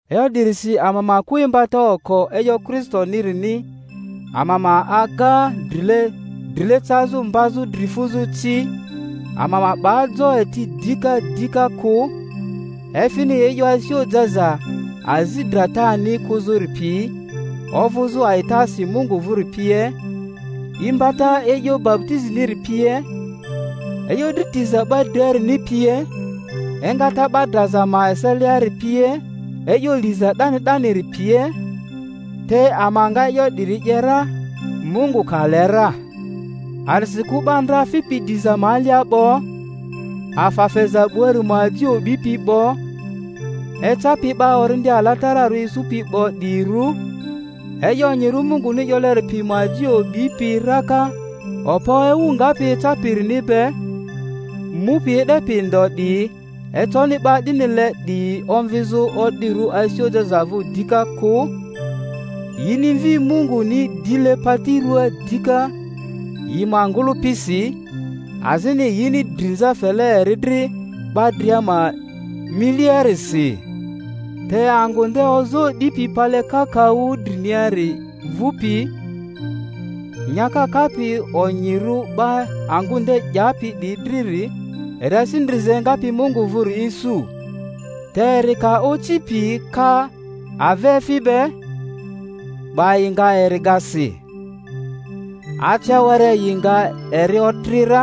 E'yo 'dirisi ama ma kᴜ imbata oko e'yo Kristonirini, ama ma aga drile drile cazᴜ mbazᴜ dri fuzᴜ ci; ama ma 'ba jo eti dika dika kᴜ, efini e'yo asi ojaza azi dratani kᴜzᴜri pi, ovᴜzᴜ a'itasi Mungu vᴜri pie, imbata e'yo baputiziniri pie, e'yo dri tiza 'ba driarini pie, engata 'ba draza ma eseliari pie, e'yo liza 'dani 'daniri pie. Te ama nga e'yo 'diri 'ye ra, Mungu ka le ra. A'disikᴜ 'ba ndra fipi diza ma alia 'bo, afa feza 'buari ma aji o'bipi 'bo, ecapi 'ba Orindi Alatararᴜ isupi 'bo 'diyirᴜ, e'yo onyirᴜ Munguni 'yoleri pi ma aji o'bipi raka okpo ewu ngapi eca-pirini be, mupi e'depi ndo 'diyi, econi 'ba 'dinile 'diyi omvizᴜ o'dirᴜ asi ojaza vᴜ dika kᴜ; yini Mvi Munguni dile pari ruaa dika yi ma ngᴜlᴜpisi, azini yini drinza fele eri dri 'ba dria ma miliarisi. Te angᴜ nde ozoo 'dipi pale kakaᴜ driniari mvupi, nyaka kapi onyirᴜ 'ba angᴜ nde 'yapi 'diyi driri eri asi ndriza engapi Mungu vᴜri isu. Te eri ka oci pi ka avaefi be, 'ba yi nga eri ga si, ace were yi nga eri otri ra;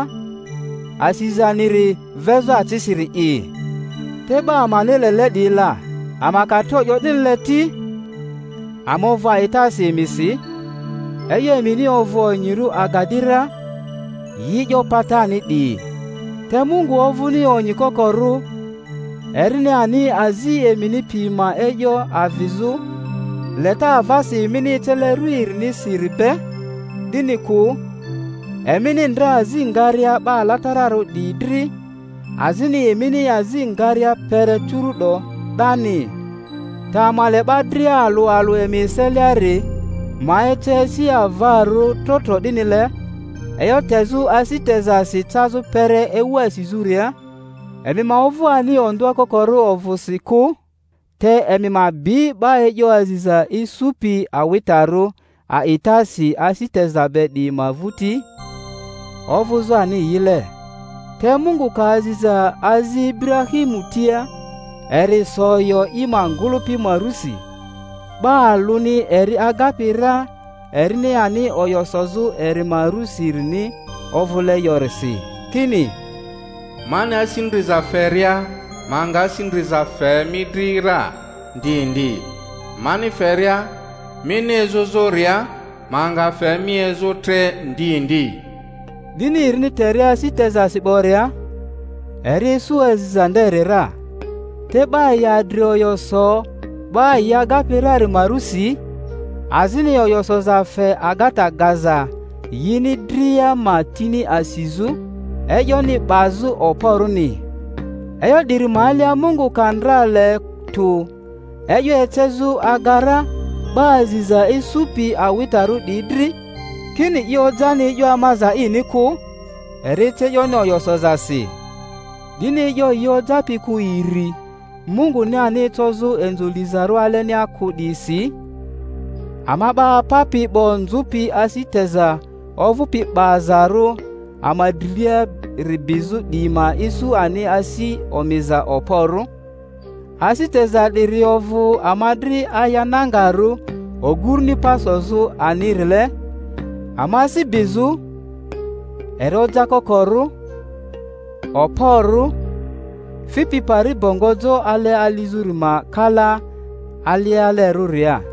asizaniri vezᴜ acisiri'i. Te 'ba amani lele 'diyi la, ama ka tro 'yo 'dinile ti, ama ovᴜ a'itasi emisi, e'yo emini ovᴜ onyirᴜ aga 'di ra, yi e'yo patani 'diyi. Te Mungu ovᴜni onyi kokorᴜ, erini ani azi emini pi ma e'yo avizᴜ, leta avasi emini ecele ru erinisiri be, 'dini kᴜ, emini ndra azi ngaria 'ba alatararᴜ 'diyi dri, azini emini azi ngaria kpere curu'do 'dani. Te ama le 'ba dria alᴜ alᴜ emi eseliari ma ece asi avarᴜ trotro 'dinile, e'yo tezᴜ asi tezasi cazᴜ kpere ewu asizᴜria, emi ma ovᴜ ani ondᴜa kokorᴜ ovᴜsi kᴜ, te emi ma bi 'ba e'yo aziza isupi awitarᴜ a'itasi asi teza be 'diyi ma vᴜti, ovᴜzᴜ ani yile. Te Mungu ka aziza azi Iburahimu tia, eri so oyo i ma ngᴜlᴜpi ma rusi, 'ba alᴜni eri agapi ra erini ani oyo sozᴜ eri ma rusirini ovᴜle yorisi, kini, Mani asi ndriza feria ma nga asi ndriza fe mi dri ra ndi ndi, mani feria mini ezᴜzᴜria ma nga fe mi ezᴜ tre ndi ndi. 'Dini erini teria asi tezasi 'boria, eri isu aziza nderi ra. Te 'ba yi adri oyo so 'ba yi agapi rari ma rusi, azini oyo soza fe agata gaza yini dria ma tini asizᴜ, e'yoni 'bazᴜ okporᴜni. E'yo 'diri ma alia Mungu ka ndra le tᴜ e'yo ecezᴜ aga ra 'ba aziza isupi awitarᴜ 'diyi dri, kini i ojani e'yo amaza ini kᴜ, eri ece e'yoni oyo sozasi, 'dini e'yo yi ojapi kᴜ iri, Munguni ani ecozᴜ inzo lizarᴜ alenia kᴜ 'diyisi, ama 'ba apapi 'bo nzᴜpi asi teza ovᴜpi 'bazarᴜ ama driliari bizᴜ 'diyi ma isu ani asi omiza okporᴜ. Asi teza 'diri ovᴜ ama dri aya nangarᴜ oguruni pa sozᴜ anirile ama asi bizᴜ, eri ojakokorᴜ, okporᴜ, fipi pari bongo jo ale alizᴜri ma kala alialerᴜria;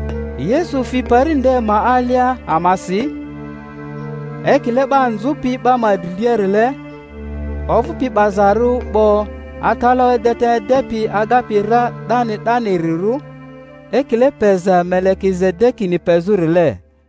Yesu fi pari nde ma alia amasi, ekile 'ba nzᴜpi 'ba ma driliarile, ovᴜpi 'bazarᴜ 'bo atalaᴜ edeta edepi agapi ra 'dani 'danirirᴜ, ekile peza Melekizedekini pezᴜrile.